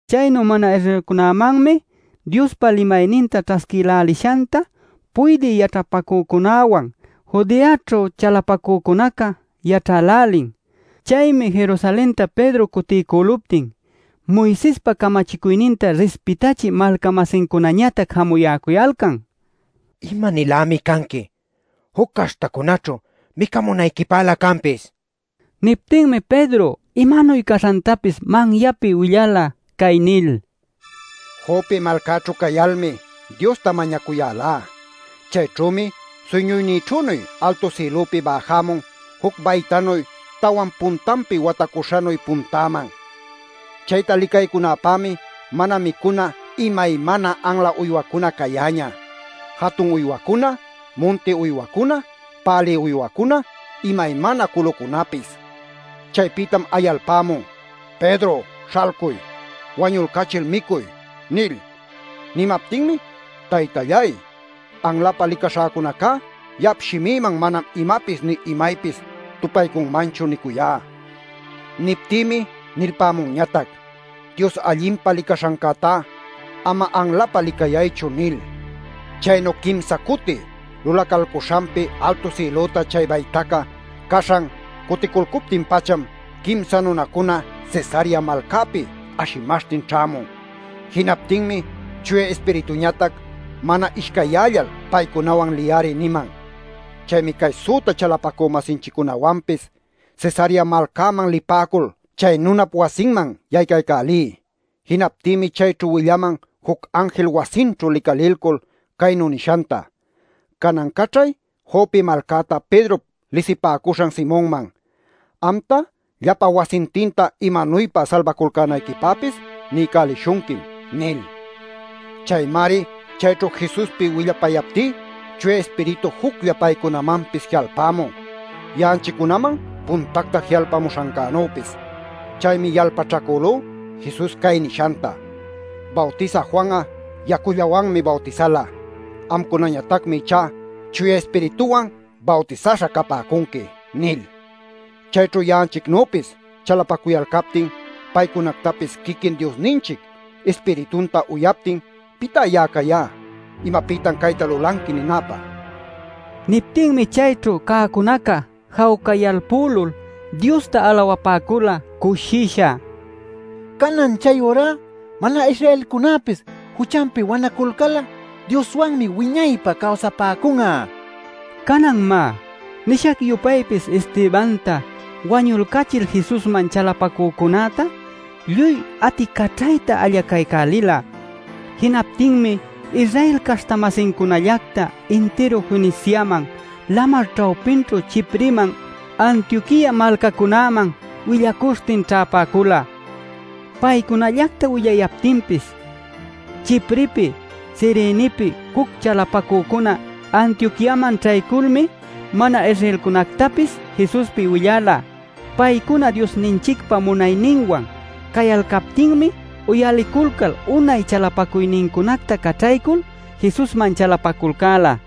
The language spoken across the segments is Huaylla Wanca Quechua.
Chaynu mana-Israelcunamanmi Diospa limayninta ćhasquïlälishanta puydï yaćhapacücunäwan Judeaćhu chalapacücunaca yaćhälälin. Chaymi Jerusalenta Pedro cutiycüluptin, Moisespa camachicuyninta rispitachï malca-masincunañatac jamuyäcuyalcan: “¿Ima-nilämi canqui juc caśhtacunaćhu micamunayquipälä canpis?” nil. Niptinmi Pedro imanuy caśhantapis manyapi willala cay nil: “Jope malcaćhu cayalmi Diosta mañacuyälá. Chayćhümi suyñuynïćhünuy altu sïlupi bäjämun juc baytanuy tawan puntanpi watacuśhanuy puntäman. Chayta licaycunäpämi mana micuna imaymana anla uywacuna cayäñä, jatun uywacuna, munti uywacuna, pälï uywacuna, imaymana culucunapis. “Chaypïtam ayalpämun: ‘Pedro śhalcuy, wañulcachil, micuy’ nil. “Nimaptinmi: ‘Taytalláy, anlapä licaśhacunacá ya'ap shimïman manam imapis nï imaypis tupaycunmanchu’ niycuyá. “Niptïmi nilpämunñatac: ‘Dios allinpa licaśhancätá ama anlapä licayaychu’ nil. “Chaynu quimsa cuti lulacalcuśhanpi altu sïlüta chay baytaca caśhan cuticulcuptin-pacham quimsa nunacuna Cesarea malcäpi ashimaśhtin ćhämun. Jinaptinmi Chuya Ispirituñatac ‘Mana ishcayyällal paycunawan liy-ari’ niman. Chaymi cay süta chalapacü-masinchiccunawanpis Cesarea malcäman lipäcul chay nunap wasinman yaycälälí. Jinaptïmi chayćhu willaman juc anjil wasinćhu licalilcul caynu nishanta: ‘Canan caćhay Jope malcäta Pedrop lisipäcuśhan Simonman. Amta, llapa wasintinta imanuypa salbaculcänayquipäpis niycälishunquim’ nil. Chaymari chayćhu Jesuspi willapayaptí Chuya Ispiritu juclla paycunamanpis ji'alpämun, ya'anchiccunaman puntacta ji'alpamuśhancänüpis. Chaymi yalpaćhacülú Jesus cay nishanta: ‘Bawtisä Juan'a yacullawanmi bawtisala. Amcunañatacmi ichá Chuya Ispirituwan bawtisaśha capäcunqui’ nil. Chayćhu ya'anchicnüpis chalapacuyalcaptin paycunactapis quiquin Diosninchic Ispiritunta uyaptin ¿pitá ya'a cayá ‘¿Imapïtan cayta lulanqui?’ ninäpä?” nin. Niptinmi chayćhu cäcunaca jawcayalpülul Diosta alawapäcula cushisha: “Canan chayurá mana-Israelcunäpis juchanpi wanaculcal'a Dioswanmi wiñaypä cawsapäcun'a” nil. Canan, má, nishac-yupaypis Estebanta wañulcachil Jesusman chalapacücunäta lluy aticaćhayta allacaycälila. Jinaptinmi Israel caśhta-masincunallacta intiru Feniciaman lamar ćhawpićhu Chipreman Antioquia malcacunäman willacuśhtin ćhäpäcula. Paycunallacta willayaptinpis Chiprepi, Cirenepi juc chalapacücuna Antioquiaman ćhayculmi mana-Israelcunactapis Jesuspi willala. Paycuna Diosninchicpa munayninwan cayalcaptinmi uyaliculcal unay chalapacuynincunacta caćhaycul Jesusman chalapaculcäla.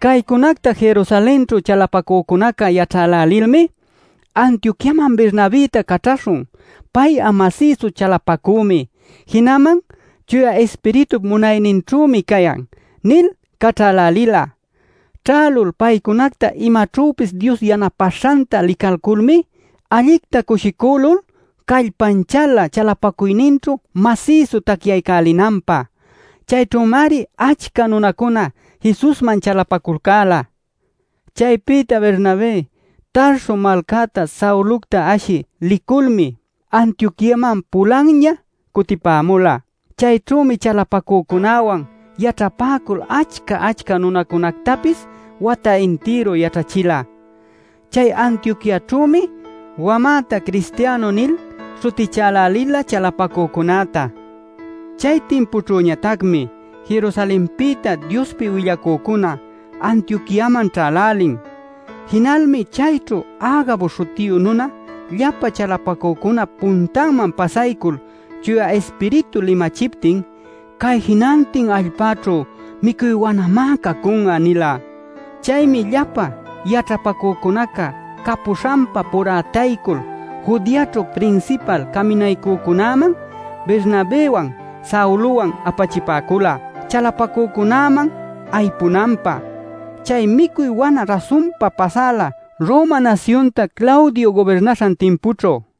Caycunacta Jerusalenćhu chalapacücunaca yaćhälälilmi: “Antioquiaman Bernabëta caćhaśhun. Pay'a masïsu chalapacümi, jinaman Chuya Ispiritup munayninćhümi cayan” nil caćhälälila. Ćhälul paycunacta imaćhüpis Dios yanapäśhanta licayculmi allicta cushicülul callpanchäla chalapacuyninćhu masïsu tacyaycälinanpä. Chayćhümari achca nunacuna Jesusman chalapaculcäla. Chaypïta Bernabé Tarso malcäta Saulocta ashï liculmi Antioquiaman pulanña cutipämula. Chayćhümi chalapacücunäwan yaćhapäcul achca achca nunacunätapis wata intiru yaćhachila. (Chay Antioquiaćhümi wamäta “cristianu” nil śhutichälälila chalapacücunäta.) Chay timpućhüñatacmi Jerusalenpïta Diospi willacücuna Antioquiaman ćhälälin. Jinalmi chayćhu Agabo śhutiyu nuna llapa chalapacücunap puntanman pasaycul Chuya Ispiritu limachiptin: “Cay jinantin allpäćhu micuy wanamá cacun'a” nila. Chaymi llapa yaćhapacücunaca capuśhanpa purätaycul Judeaćhu prinsipal caminaycücunäman Bernabëwan Saulowan apachipäcula chalapacücunäman aypunanpä. (Chay micuy wana rasunpam pasäla Roma nasyunta Claudio gubirnaśhan timpućhu.)